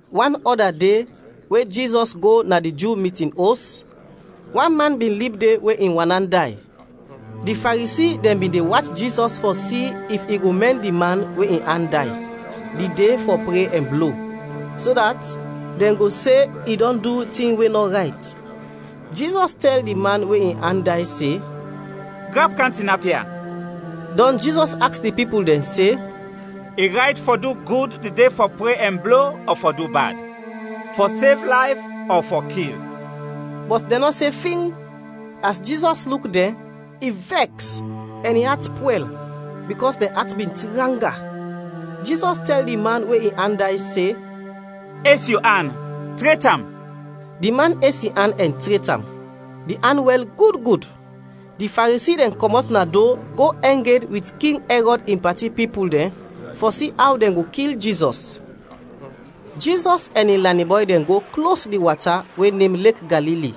Wan ɔda de, we Jizɔs go na di Ju mitin os, wan man bin lib de we in wan an day. Di Faresi dɛn bin de wach Jizɔs fɔ si if i go mɛn di man we in an day, di de fɔ pre ɛn blo, so dat dɛn go se i dɔn du tin we nɔ rayt. Jizɔs tɛl di man we in an day se, “Grap, kam tinap ya.” Dɔn Jizɔs aks di pipul dɛn se, “I rayt fɔ du gud di de fɔ pre ɛn blo ɔ fɔ du bad? Fɔ sev layf ɔ fɔ kil?” Bɔt dɛn nɔ se fing! As Jizɔs luk dɛn, i vɛks ɛn in at pwɛl bikɔs dɛn at bin tranga. Jizɔs tɛl di man we in an day se, “Es yu an, tret am.” Di man es in an ɛn tret am. Di an wɛl gud gud. Di Faresi dɛn kɔmɔt na do, go ɛng ed wit King Ɛrɔd in pati pipul dɛn fɔ si aw dɛn go kil Jizɔs. Jizɔs ɛn in lanin bɔy dɛn go klos di wata we nem Lek Galili.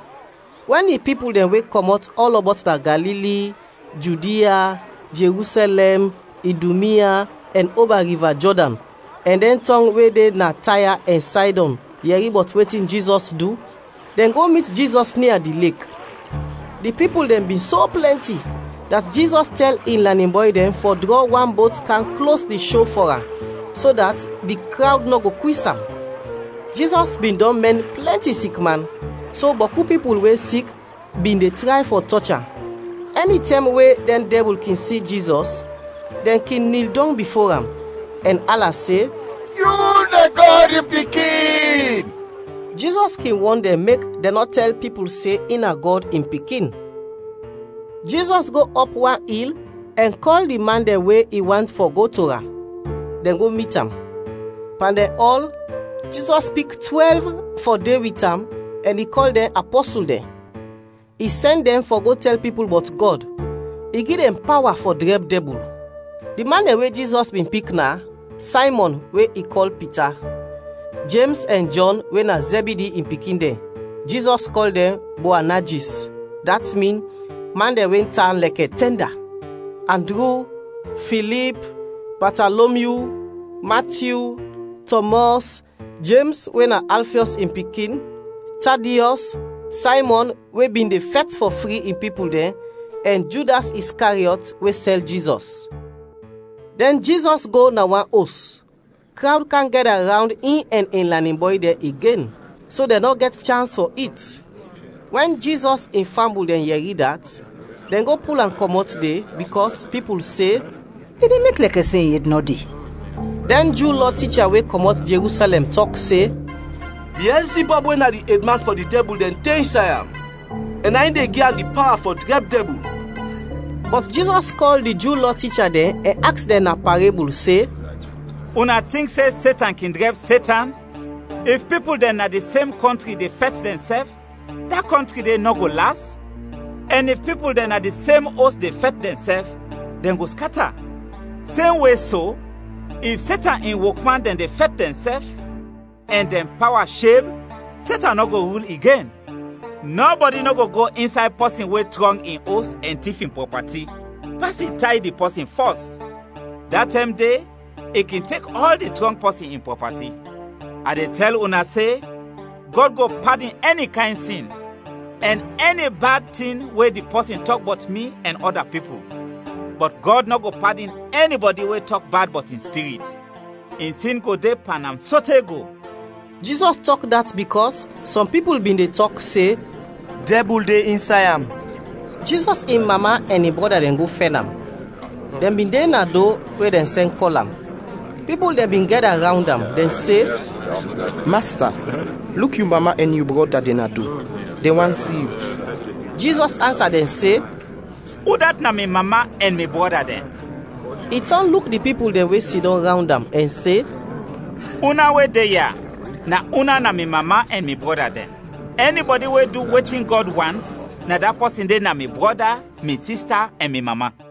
Wɛn di pipul dɛn we kɔmɔt ɔlɔbɔt na Galili, Judia, Jerusɛlɛm, Idumia, ɛn oba Riva Jɔdan, ɛn dɛn tɔng we de na Taya ɛn Saydɔn yɛri bɔt wetin Jizɔs du, dɛn go mit Jizɔs nia di lek. Di pipul dɛn bin so plɛnti, dat Jizɔs tɛl in lanin bɔy dɛn fɔ drɔ wan bot kam klos di sho fɔ am, so dat di krawd nɔ go kwis am. Jizɔs bin dɔn mɛn plɛnti sikman, so bɔku pipul we sik bin de tray fɔ tɔch am. Ɛnitɛm we dɛn dɛbul kin si Jizɔs, dɛn kin nil dɔng bifo am, ɛn ala se, “Yu na Gɔd in Pikin!” Jizɔs kin wɔn dɛn mek dɛn nɔ tɛl pipul se in na Gɔd in Pikin. Jizɔs go ɔp wan il ɛn kɔl di man dɛn we i want fɔ go to am; dɛn go mit am. Pan dɛn ɔl, Jizɔs pik twɛlv fɔ de wit am ɛn i kɔl dɛn apɔsul dɛn. I sɛn dɛn fɔ go tɛl pipul bɔt Gɔd, I gi dɛn pawa fɔ drɛb dɛbul. Di man dɛn we Jizɔs bin pik na: Saymɔn we i kɔl Pita; Jems ɛn Jɔn we na Zɛbidi in pikin dɛn (Jizɔs kɔl dɛn Boanajis, dat min “Man dɛn we tan lɛkɛ tɛnda”); Andru, Filip, Batalomyu, Matyu, Tɔmɔs, Jems we na Alfiɔs in pikin, Tadiɔs, Saymɔn we bin de fɛt fɔ fri in pipul dɛn, ɛn Judas Iskariɔt we sɛl Jizɔs. Dɛn Jizɔs go na wan os. Krawd kam gɛda rawnd in ɛn in lanin bɔy dɛn igen so dɛn nɔ gɛt chans fɔ it. Wɛn Jizɔs in fambul dɛn yɛri dat, dɛn go pul am kɔmɔt de, bikɔs pipul se, “I de mek lɛkɛ se in ed nɔ de.” Dɛn Ju Lɔ ticha we kɔmɔt Jerusɛlɛm tɔk se, “Biɛlzibɔb we na di edman fɔ di dɛbul dɛn, de insay am, ɛn na in de gi am di pawa fɔ drɛb dɛbul.” Bɔt Jizɔs kɔl di Ju Lɔ ticha dɛn ɛn aks dɛn na parebul se, “Una tink se Setan kin drɛb Setan? If pipul dɛn na di sem kɔntri de fɛt dɛnsɛf, da kɔntri de nɔ go las, ɛn if pipul dɛn na di sem os de fɛt dɛnsɛf, dɛn go skata. Semwe so, if Setan in wokman dɛn de fɛt dɛnsɛf ɛn dɛn pawa sheb, Setan nɔ go rul igen! “Nɔbɔdi nɔ go go insay pɔsin we trɔng in os ɛn tif in prɔpati, pas i tay di pɔsin fɔs, da tɛm de i kin tek ɔl di trɔng pɔsin in prɔpati. “A de tɛl una se, Gɔd go padin ɛni kayn sin, ɛn ɛni bad tin we di pɔsin tɔk bɔt mi ɛn ɔda pipul; bɔt Gɔd nɔ go padin ɛnibɔdi we tɔk bad bɔt in Spirit; in sin go de pan am sote go.” Jizɔs tɔk dat bikɔs sɔm pipul bin de tɔk se, “Dɛbul de insay am.” Jizɔs in mama ɛn in brɔda dɛn go fɛn am. Dɛn bin de na do we dɛn sɛn kɔl am. Pipul dɛn bin gɛda rawnd am, dɛn se, “Masta, luk yu mama ɛn yu brɔda dɛn na do, dɛn want si yu.” Jizɔs ansa dɛn se, “Udat na mi mama ɛn mi brɔda dɛn?” I tɔn luk di pipul dɛn we sidɔm rawnd am ɛn se, “Una we de ya, na una na mi mama ɛn mi brɔda dɛn! Ɛnibɔdi we du wetin Gɔd want, na da pɔsin de na mi brɔda, mi sista ɛn mi mama.”